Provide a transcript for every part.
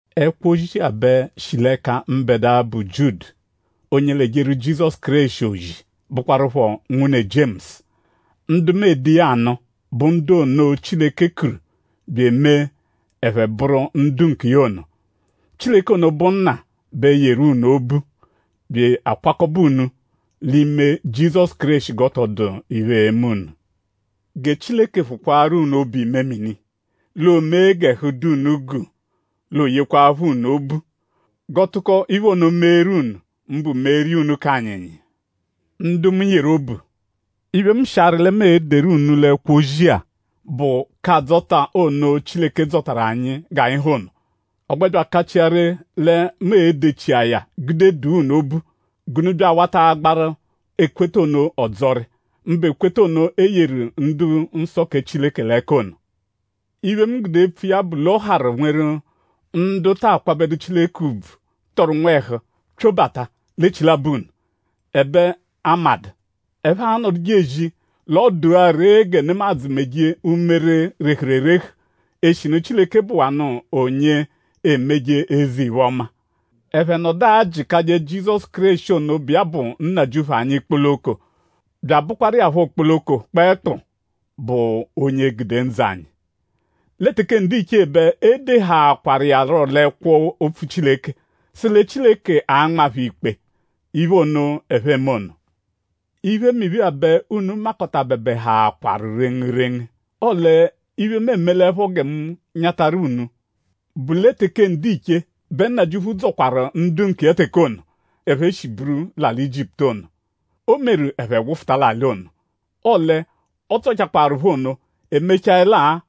Ẹkwo-ozi-a bẹ shi l'ẹka mbẹdua, bụ Jiudu; onye l'ejeru Jizọsu Kéreshi ozi; bụkwarupho nwune Jiemusu. Ndu mu ede iya anụ bụ ndu ono, Chileke kuru bya emee ẹphe bụru ndu nkiya ono. Chileke ono, bụ Nna bẹ yeru unu obu; bya akwakọbe unu l'ime Jizọsu Kéreshi g'ọ tọ dụ iphe, e-me unu. Gẹ Chileke phụkwaaru unu obu-imemini; l'oomee g'ẹhu dụ unu guu; l'ooyekwaaphọ unu obu. G'ọ tụko iphe ono meeru unu; mbụ meeru iya unu k'anyịnyi. Ndu mu yeru obu; iphe, mu shi arị lẹ mu e-deru unu l'ẹkwo-ozi-a bụ k'adzọta ono, Chileke dzọtaru anyi g'anyi ha ono. Ọ gbẹ bya akachia ree lẹ mu e-dechia ya gude dụa unu obu; g'unu bya awata agbaru ekweta ono ọdzori; mbụ ekweta ono e yeru ndu-nsọ kẹ Chileke l'ẹka ono. Iphe, mu gude epfu iya bụ l'ọ harụ nweru ndu ta akwabẹdu Chileke ùbvù, tọru nwẹhu pyobata l'echilabọ unu; ẹbe a madụ. Ẹphe anọduje ezi l'ọ dụa ree gẹ nemadzụ meje umere, rehuru erehu; eshinu Chileke bụwanu onye emeje eze-iphe-ọma. Ẹphe nọdu ajịkaje Jizọsu Kéreshi ono, bụ iya bụ Nnajịuphu anyi kpoloko; bya abụkwaru iya phọ kpoloko kpẹekpu bụ onye gude ndzụ anyi. Lẹ teke ndiche bẹ e dehaakwaru iya rọ l'ẹkwo-opfu Chileke sụ lẹ Chileke a-nma phẹ ikpe iphe ono, ẹphe eme ono. Iphemiphe-a bẹ unu makọtabebehaakwaru rengurengu; ọle iphe, mu emelẹpho gẹ mu nyatarụ unu bụ lẹ teke ndiche bẹ Nnajịuphu dzọkwaru ndu nkiya teke ono, ẹphe shi buru l'alị Ijiputu ono. O meru ẹphe wụfuta l'alị ono. Ọle ọ dzọchakwaaru phẹ ono; e mechaẹlaa;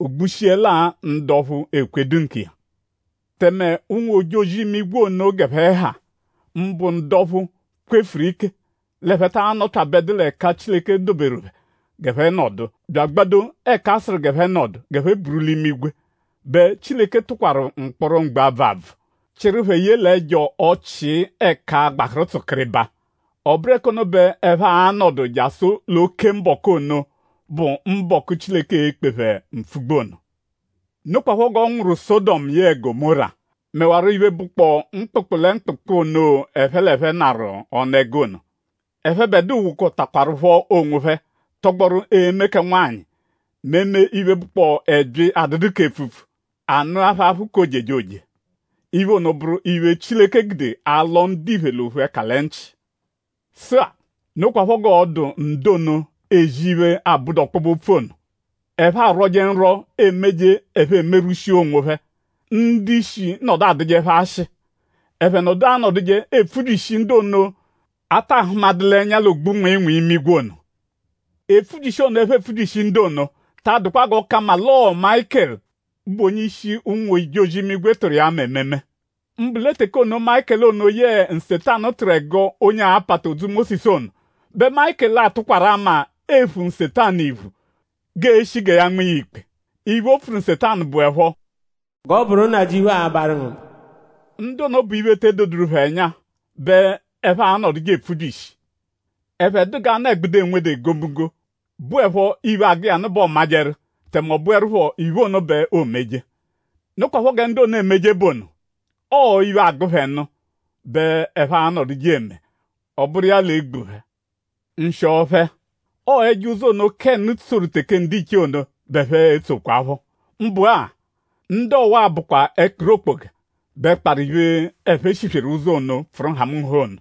o gbushiẹlaa ndu ọphu ekwedu nkiya Tẹme ụnwu-ojozi-imigwe ono g'ẹphe ha; mbụ ndu ọphu, kwefuru ike l'ẹphe taa nọpyabedu l'ẹka Chileke doberu phẹ g'ẹphe nọdu; bya agbado ẹka a sụru g'ẹphe buru l'imigwe bẹ Chileke tụkwaru mkpọro mgbe-abvụ-abvụ; chịru phẹ ye l'ẹjo ọchii ẹka gbahụru tsụkiribaa. Ọ bụru ẹka ono bẹ ẹphe a-nọdu jasụ l'oke mbọku ono, bụ mbọku, Chileke e-kpe phẹ mpfugbu ono. Nokwaphọ g'ọ nwụru Sọdomu yẹe Gọmóra; mẹwaro iphe, bụkpoo mkpụkpu lẹ mkpụkpu ono, ẹphe l'ẹphe narụ ọnu-ẹgu ono. Ẹphebedua wokọtakwarupho onwophẹ tọgboru eme kẹ nwanyị mẹ eme iphe, bụkpoo ẹbyi, adụdu k'epfupfu. A nụa phẹ aphụ k'ojejoje. Iphe ono bụru iphe, Chileke gude alọ ndiphe l'ophu ẹka lẹ nchị. Sụ-a; nokwaphọ g'ọo-dụ ndu ono, ezi iphe, abụdu ọkpobe-opfu ono. Ẹphe arwọje nrwọ, emeje ẹphe emerwushia onwophẹ; ndu-ishi nọdu adụje phẹ ashị; ẹphe nọdu anọduje epfubyishi ndu ono, a ta ahụmadu l'ẹnya l'ogbu-nwịinwii imigwe ono. Epfubyishi ono, ẹphe epfubyishi ndu ono ta adụkwa g'ọ ka mma l'ọo Mayịkelu, bụ onye-ishi ụnwu-ojozi l'imigwe tụru iya ama ememe. Mbụ lẹ teke ono, Mayịkelu ono yẹe Nsetanu tụru ẹgo onye a-pata odzu Mósisu ono bẹ Mayịkelu 'atụkwaru ama ephu Nsetanu iphu; g'e-shi gẹ ya nma iya ikpe. Iphe, o pfuru Nsetanu bụepho: “G'ọ bụru Nnajịuphu a-barụ ngu mba.” Ndu ono bụ iphe, te edoduru phẹ ẹnya bẹ ẹphe anọduje epfubyishi. Ẹphe dụ g'anụ-ẹgbudu, enwedu egomunggo, bụepho iphe, agụ iya nụ bẹ ọomajeru; tẹme ọ bụerupho iphe ono bẹ oomeje. Nokwaphọ gẹ ndu ono emeje bụ ono. Ọo iphe, agụ phẹ nụ bẹ ẹphe anọduje eme; ọ bụru iya l'e-gbu phẹ. Nshịo phẹ! Ọo ẹjo ụzo ono, Kénu tsoru teke ndiche ono bẹ ẹphe etsokwaphọ. Mbụ-a; ndu ọwa-a bụkwa ẹkpiri okpoga bẹ kparụ iphe, ẹphe shisweru ụzo ono, pfụru nhamụnha ono;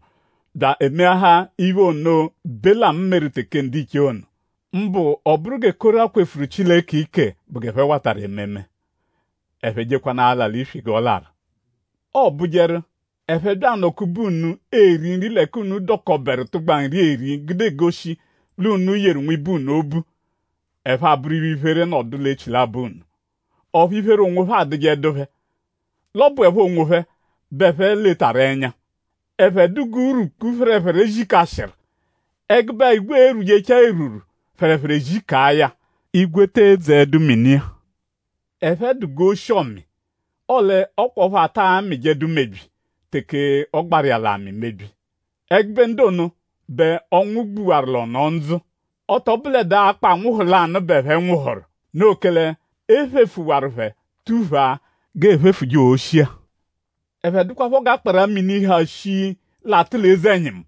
bya emeahaa iphe ono, Belamu meru teke ndiche ono. Mbụ ọ bụru gẹ Kora kwefuru Chileke ike bụ g'ẹphe watarụ ememe. Ẹphe jekwanụ ala l'iswi g'ọ larụ. Ọobujeru; ẹphe -bya anọ-kube unu; eri nri l'ẹka unu dọkoberu tụgba nri eri gude egoshi l'unu yeru nwibe unu obu; ẹphe abụru iphe-iphere nọdu l'echilabọ unu. Ọphu iphere onwophẹ adụjedu phẹ; l'ọ bụepho onwophẹ bẹ ẹphe letaru ẹnya. Ẹphe dụ g'urwukpu, phẹrephere zikashịru; ẹgube-a igwe erwuchaa erwurwu; phẹrephere ezikaa ya; igwe te edzeẹdu mini-a. Ẹphe dụ g'oshi-ọmi; ọle ọ kwa ọphu ata amịjedu mebyi teke ọ gbaru iya l'amị mebyi. Ẹgube ndu ono bẹ ọnwu gbuwaru l'ọno-ndzụ; ọ tọ bụledua akpọ anwụhu lanụ bẹ ẹphe nwụhuru; noo kẹle e phefuwaru phẹ tuphaa g'eephefuje oshi-a. Ẹphe dụkwapho g'akpara-mini, ha shii, l'atụ l'eze-ẹnyimu.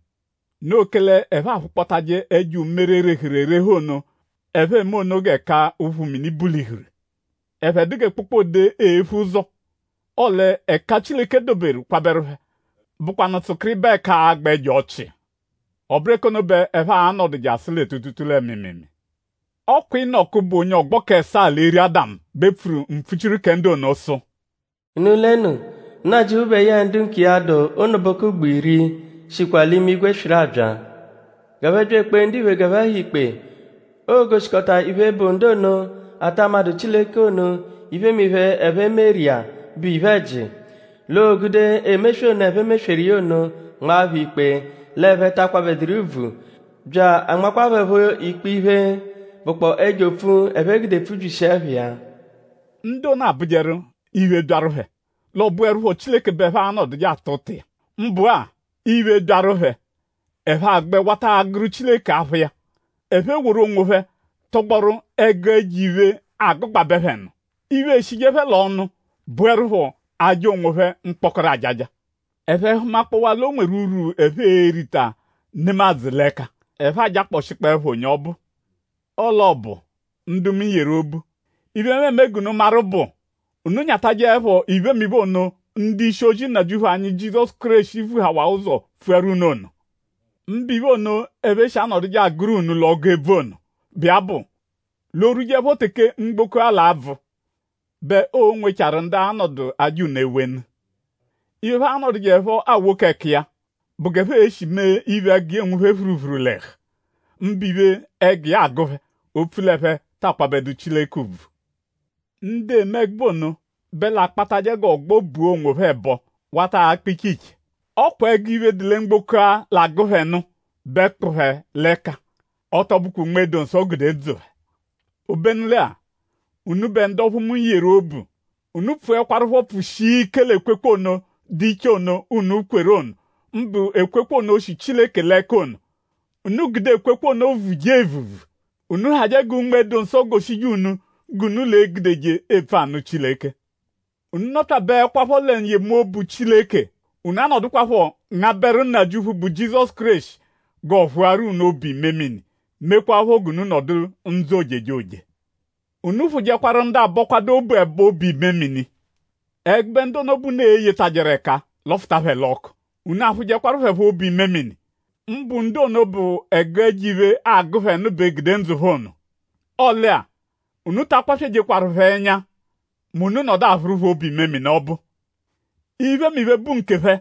Noo kẹle ẹphe aphụkpotaje ẹjo umere, rehuru erehu ono, ẹphe eme ono g'ẹka ụphu mini bulihuru. Ẹphe dụ gẹ kpokpode, ephu ụzo. Ọle ẹka Chileke doberu kwabẹru phẹ bụkwanu tsụkiribaa ẹka agba ẹjo ọchii. Ọ bụru ẹka ono bẹ ẹphe a-nọdu jasụ lẹ tuutuutuu lẹ mịimiimii. Ọ kwa Inọku, bụ onye ọgbo k'ẹsaa l'eri Ádamu bẹ pfuru mpfuchiru kẹ ndu ono sụ: “Unu lenu; Nnajịuphu bẹ yẹe ndu nkiya, dụ ụnubuku ugbo iri shikwa l'imigwe swịru abya; g'ẹphe bya ekpee ndiphe g'ẹphe ha ikpe. Oo-goshikọta iphe, bụ ndu ono, ata madụ Chileke ono iphemiphe, ẹphe meru iya, bụ iphe-ẹji; l'oo-gude emeswe ono, ẹphe mesweru iya ono nmaa phẹ ikpe l'ẹphe ta akwabẹduru iya ùbvù; bya anmakwa phẹ phọ ikpe iphe, bụkpoo ẹjo opfu, ẹphe gude pfubyishia ẹpha iya.” Ndu ono abụjeru; iphe -byaru phẹ; l'ọ bụerupho Chileke bẹ ẹphe anọduje ata ụta iya; mbụ-a; iphe -byaru phẹ; ẹphe agbẹ wata agụru Chileke aphụ iya. Ẹphe eworu onwophẹ tọgboru ẹgu ẹjo-iphe, agụgbabe phẹ nụ. Iphe, eshije phẹ l'ọnu bụerupho aja onwophẹ mkpọkoro ajaja. Ẹphe -hụmakpowa l'o nweru urwu, ẹphe e-rita nemadzụ l'ẹka; ẹphe ajakpọshikpoepho onye ọbu. Ọle ọ bụ; ndu mu yeru obu; iphe, mu eme g'unu maru bụ; unu nyatajẹepho iphemiphe ono, ndu-ishi-ozi Nnajịuphu anyi Jizọsu Kéreshi vuhawaa ụzo pfuaru unu ono. Mbụ iphe ono, ẹphe shi anọduje agụru unu l'ọgu ebvu ono, bụ iya bụ: “L'o -rwujeẹpho teke mgboko-a l'a-bvụ bẹ o nwechaaru ndu a-nọdu aja unu ewenu. Iphe, ẹphe a-nọdujeepho awoko ẹka iya bụ g'ẹphe e-shi mee iphe, ẹgu iya enwu phẹ phuruphuru l'ẹhu; mbụ iphe, ẹgu iya agụ phẹ; opfu l'ẹphe ta akwabẹdu Chileke ùbvù.” Ndu eme ẹgube ono bẹ l'akpatajẹ g'ọgbo bua onwophẹ ẹbo; wata akpa iche iche. Ọ kwa ẹgu iphe, dụ lẹ mgboko-a, l'agụ phẹ nụ bẹ kpụ phẹ l'ẹka; ọ tọ bụkwa Unme-dụ-Nsọ gude ndzụ phẹ. Obenu lẹ-a; unubẹ ndu ọphu mu yeru obu; unu pfụekwarupho pfụshia ike l'ekwekwe ono, dụ iche ono, unu kweru ono; mbụ ekwekwe ono, shi Chileke l'ẹka ono. Unu gude ekwekwe ono vuje evuvu. Unu hajẹ gẹ Unme-dụ-Nsọ goshije unu g'unu l'e-gudeje epfu anụ Chileke. Unu nọpyabeekwapho lẹ n-yemobu Chileke; unu anọdukwapho ngabẹru Nnajịuphu, bụ Jizọsu Kéreshi g'ọo-phụaru unu obu-imemini; mekwaaphọ g'unu nọdu ndzụ ojejoje. Unu phụjekwaru ndu abọkwadu obu ẹbo obu-imemini. Ẹgube ndu ono bẹ unu e-yetajẹru ẹka; lọfuta phẹ l'ọku. Unu aphụjekwaru phẹ phọ obu-imemini; mbụ ndu ono, bụ ẹgu ẹjo-iphe agụ phẹ nụ bẹ gude ndzụ phẹ ono. Ọle-a; unu ta akwaswejekwaru phẹ ẹnya mẹ unu -nọdu aphụru phẹ obu-imemini ọbu. Iphemiphe, bụ nkephẹ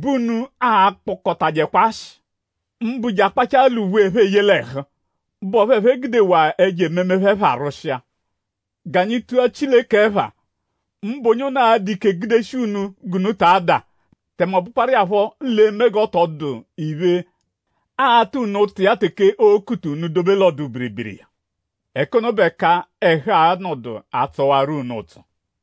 bẹ unu a-kpọkotajekwa ashị; mbụ je akpachaa l'uwe, ẹphe eye l'ẹhu, bụ ọphu ẹphe gudewaa ẹjo-ememe phẹ pharwụshia. G'anyi tua Chileke ẹpha; mbụ onye ono, a-dụ ike gudeshia unu g'unu ta ada; tẹme ọ bụkwaru iya phọ l'e-me g'ọ tọ dụ iphe, aa-ta unu ụta iya teke oo-kuta unu dobe l'ọdu-biribiri iya. Ẹka ono bụ ẹka ẹhu a-nọdu atsọwaro unu ụtso.